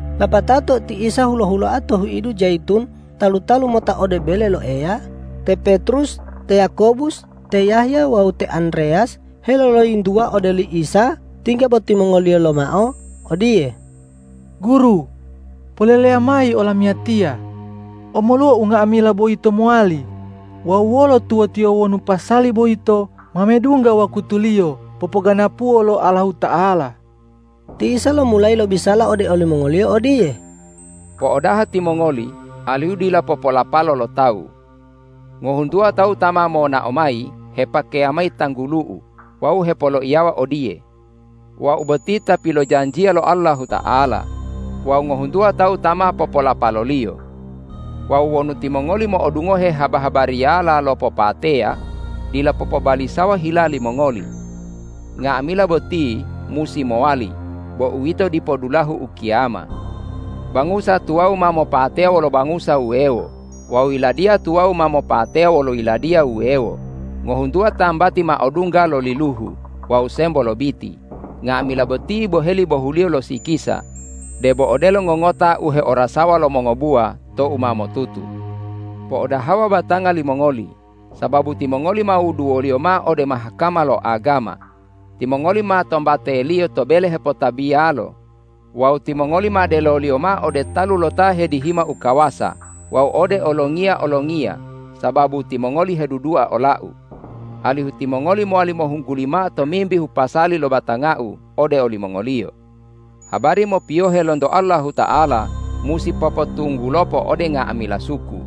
Lapatao tou ti Isa hulo-huloa to huidu Jayitun talu-talu mota ode bele lo Eya, te Petrus, te Yakobus, te Yahya wawu te Andreyas heloloyintuwa ode oli Isa tingga bo timongoliyo lomao odiye, ”Guru, poleleya mayi olamiyatiya, omoluwa unga'amila boyito mowali wawu wolo tuwotiyo wonu pasali boyito ma medungga wakutuliyo popoganapuwo lo Allahuta'ala.” Ti Isa lomulayi lobisala ode olimongoliyo odiye,”Po'odaha timongoli alihu dila popolapalo lo tawu! Ngohuntuwa tawu ta ma monao mayi hepakeya mayi tanggulu-U wawu hepoloiyawa odiye, ’Wau boti ta pilojanjiya lo Allahuta'ala,’ wawu ngohuntuwa tawu ta ma popolapaloliyo. Wawu wonu timongoli mo'odungohe haba-habariyala lo popateya, dila popobalisawa hila limongoli. Nga'amila boti musi mowali, bo uwito dipo dulahu ukiyama. Bangusa tuwawu ma mopateya wolo bangusa wuwewo wawu yiladiya tuwawu ma mopateya wolo yiladiya wuwewo. Ngohuntuwa tambati ma odungga lo liluhu wawu sembo lobiti. Nga'amila boti boheli bohuliyo lo sikisa debo odelo ngongota u heorasawa lo mongobuwa tou ma motutu. Po'odahawa batanga limongoli! Sababu timongoli ma wuduwoliyo mao ode Mahkama lo agama. Timongoli ma tombateliyo to bele hepotabiyalo wawu timongoli ma deloliyo mao ode talu lo ta hedihima u kawasa wawu ode olongiya-olongiya sababu timongoli hedudua ola-U, alihu timongoli mowali mohungguli mao tomimbihu pasali lo batanga-U ode olimongoliyo. Habari mopiyohe lonto Allahuta'ala musi popotunggulopo ode nga'amila suku.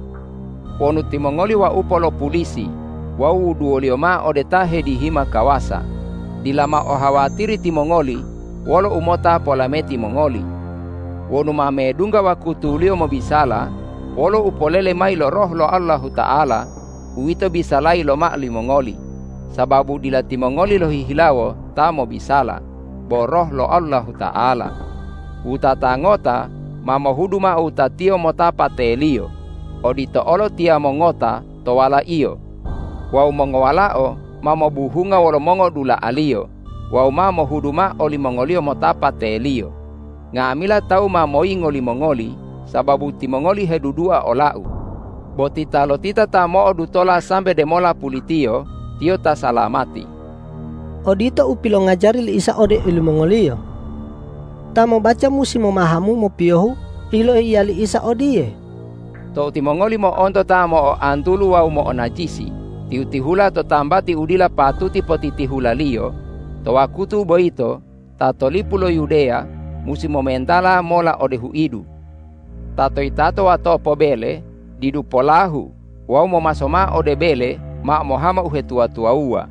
Wonu timongoli waupo lo pulisi wawu wuduwoliyo mao ode ta hedihima kawasa, dila mao ohawatiri timongoli wolo u mota polameti mongoli. Wonu ma medungga wakutuliyo mobisala, wolo u polele mayi lo Roh lo Allahuta'ala uwito bisalayi lomao limongoli, sababu dila timongoli lohihilawo ta mobisala, bo Roh lo Allahuta'ala. Wutata ngota ma mohudu mao wutatiyo mota pateliyo, odito olo tiyamo ngota to walaiyo. Wawu mongowalao ma mobuhunga wolo mongodula'aliyo wawu ma mohudu mao olimongoliyo mota pateliyo. Nga'amila tawu ma moyingo limongoli sababu timongoli hedudua ola-U. Bo titalotita ta mo'odutola sambe demola pulitiyo, tiyo ta salamati.” Odito u pilongajari li Isa ode olimongoliyo. Ta mobaca musi momahamu mopiyohu u yiloiya li Isa odiye,”Tou timongoli mo'onto ta mo'oantulu wawu mo'onajisi tihu-tihula to tambati u dila patuti potitihulaliyo, to wakutu boyito ta to lipu lo Yudeya musi momentala mola ode huidu. Ta to yitato watopo bele didu polahu wawu momaso mao ode bele mao mohama uhetuwa-tuwawuwa.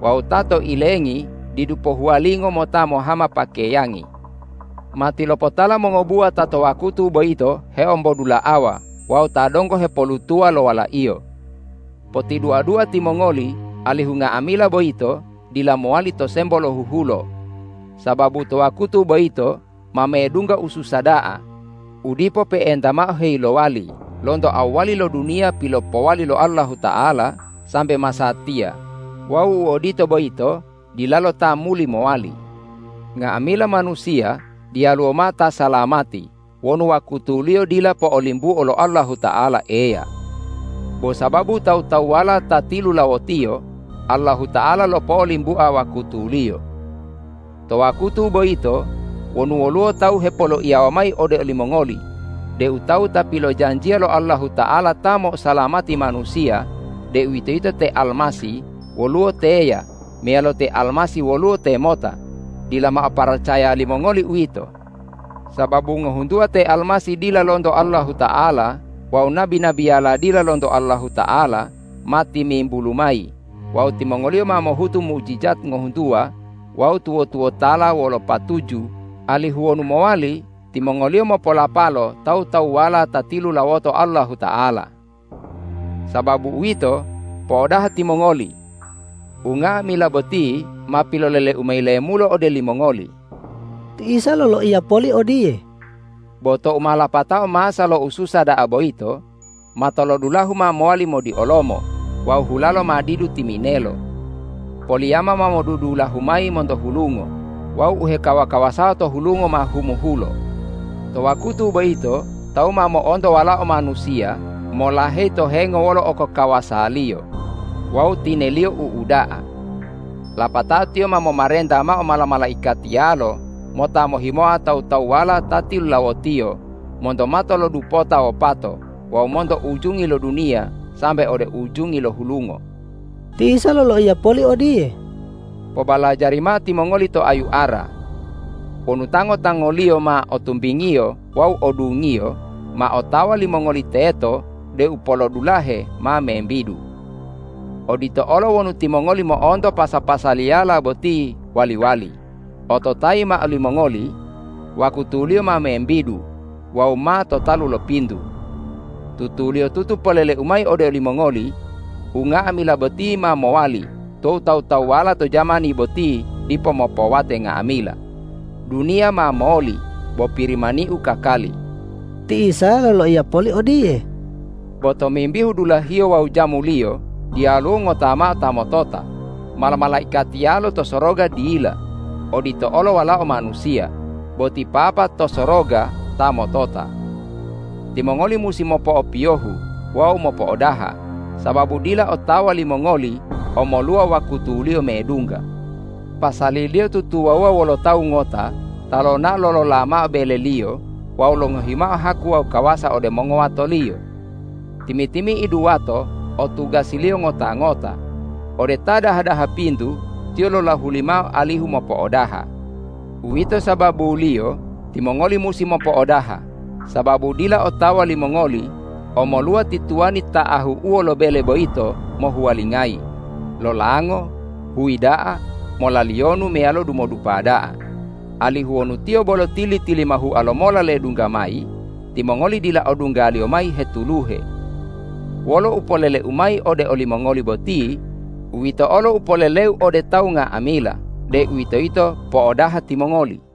Wawu ta to ilengi didu pohuwalingo mota mohama pakeyangi. Matilopotala mongobuwa ta to wakutu boyito heombodula'awa wawu ta donggo hepolutuwa lo walaiyo. Potidua-dua timongoli alihu nga'amila boyito dila mowali to sembo lohuhulo. Sababu to wakutu boyito ma medungga ususa da'a, u dipo pe'enta mao heyilowali lonto awwali lo duniya pilopowali lo Allahuta'ala, sambe masatiya wawu u odito boyito dilalo ta muli mowali. Nga'amila manusiya diyaluwo mao ta salamati wonu wakutuliyo dila po'olimbuo lo Allahuta'ala Eya. Bo sababu tawu-tawuwala ta tilulawotiyo, Allahuta'ala lopo'olimbua wakutuliyo. To wakutu boyito wonu woluwo tawu hepoloiyawa mayi ode olimongoli deu Tawu ta pilojanjiya lo Allahuta'ala ta mo'osalamati manusiya, deuwitoyito te Almasih, woluwo teya meyalo te Almasih woluwo temota, dila mao paracaya limongoli uwito. Sababu ngohuntuwa te almasih dila lonto Allahuta'ala wawu nabi-nabiyala dila lonto Allahuta'ala, ma timimbulu mayi wawu timongoliyo ma mohutu mujijat ngohuntuwa wawu tuwo-tuwotala wolo patuju, alihu wonu mowali, timongoliyo mopolapalo tawu-tawuwala ta tilulawoto Allahuta'ala. Sababu uwito, po'odaha timongoli! Unga'amila boti ma pilolele-U mayi lemulo ode limongoli.” Ti Isa loloiya poli odiye,”Bo tou ma lapatao masa lo u susa da'a boyito, matolodulahu ma mowali modiolomo wawu hulalo ma didu timinelo. Poliyama ma modudulahu mayi monto hulungo wawu u hekawa-kawasawa to hulungo ma humuhulo. To wakutu boyito tawu ma mo'onto Walao Manusiya molaheyi to hengo wolo okokawasa-Liyo wawu tine-Liyo u uda'a. Lapatao Tiyo ma momarenta mao mala-malaikatiyalo mota mohimoa tawu-tawuwala ta tilulawo-Tiyo monto mato lo dupota wopato wawu monto ujungi lo duniya sambe ode ujungi lo hulungo.” Ti Isa loloiya poli odiye,”Pobalajari mao timongoli to ayu ara. Wonu tango-tangoliyo ma o tumbingiyo wawu o dungiyo, ma otawa limongoli teto deu polodulahe ma membidu. Odito olo wonu timongoli mo'onto pasa-pasaliyala boti wali-wali, ototayimao limongoli: Wakutuliyo ma membidu wawu ma to talu lo pintu. Tutuliyotutu polele-U mayi ode olimongoli: Unga'amila boti ma mowali tou tawu-tawuwala to jamani boti dipo mopowate nga'amila. Duniya ma moli, bo Pirimani-U kakali.” Ti Isa loloiya poli odiye,”Bo tomimbihu dulahiyo wawu jamuliyo diyaluwo ngota mao ta motota, mala-malaikatiyalo to soroga dila, odito olo Walao Manusiya, bo ti Papa to soroga ta motota. Timongoli musi mopo'opiyohu wawu mopo'odaha, sababu dila otawa limongoli omoluwa wakutuliyo medungga. Pasaliliyo tutuwawuwa wolo tawu ngota ta lonao lolola mao beleliyo wawu longohi mao haku wawu kawasa ode mongowatoliyo. Timi-timi'idu wato o tugasiliyo ngota-ngota. Ode ta daha-daha pintu tiyo lolahuli mao alihu mopo'odaha. Uwito sababuliyo timongoli musi mopo'odaha, sababu dila otawa limongoli omoluwa ti tuwani ta ahu'uwo lo bele boyito mohuwalingayi, lolango, huyi da'a, molaliyonu meyalo dumodupa da'a, alihu wonu tiyo bolo tili-tilimahua lomola ledungga mayi, timongoli dila odunggaliyo mayi hetuluhe. Wolo u pilolele-U mayi ode olimongoli boti, uwito olo u polele-U ode tawu nga'amila, deuwitoyito po'odaha timongoli!”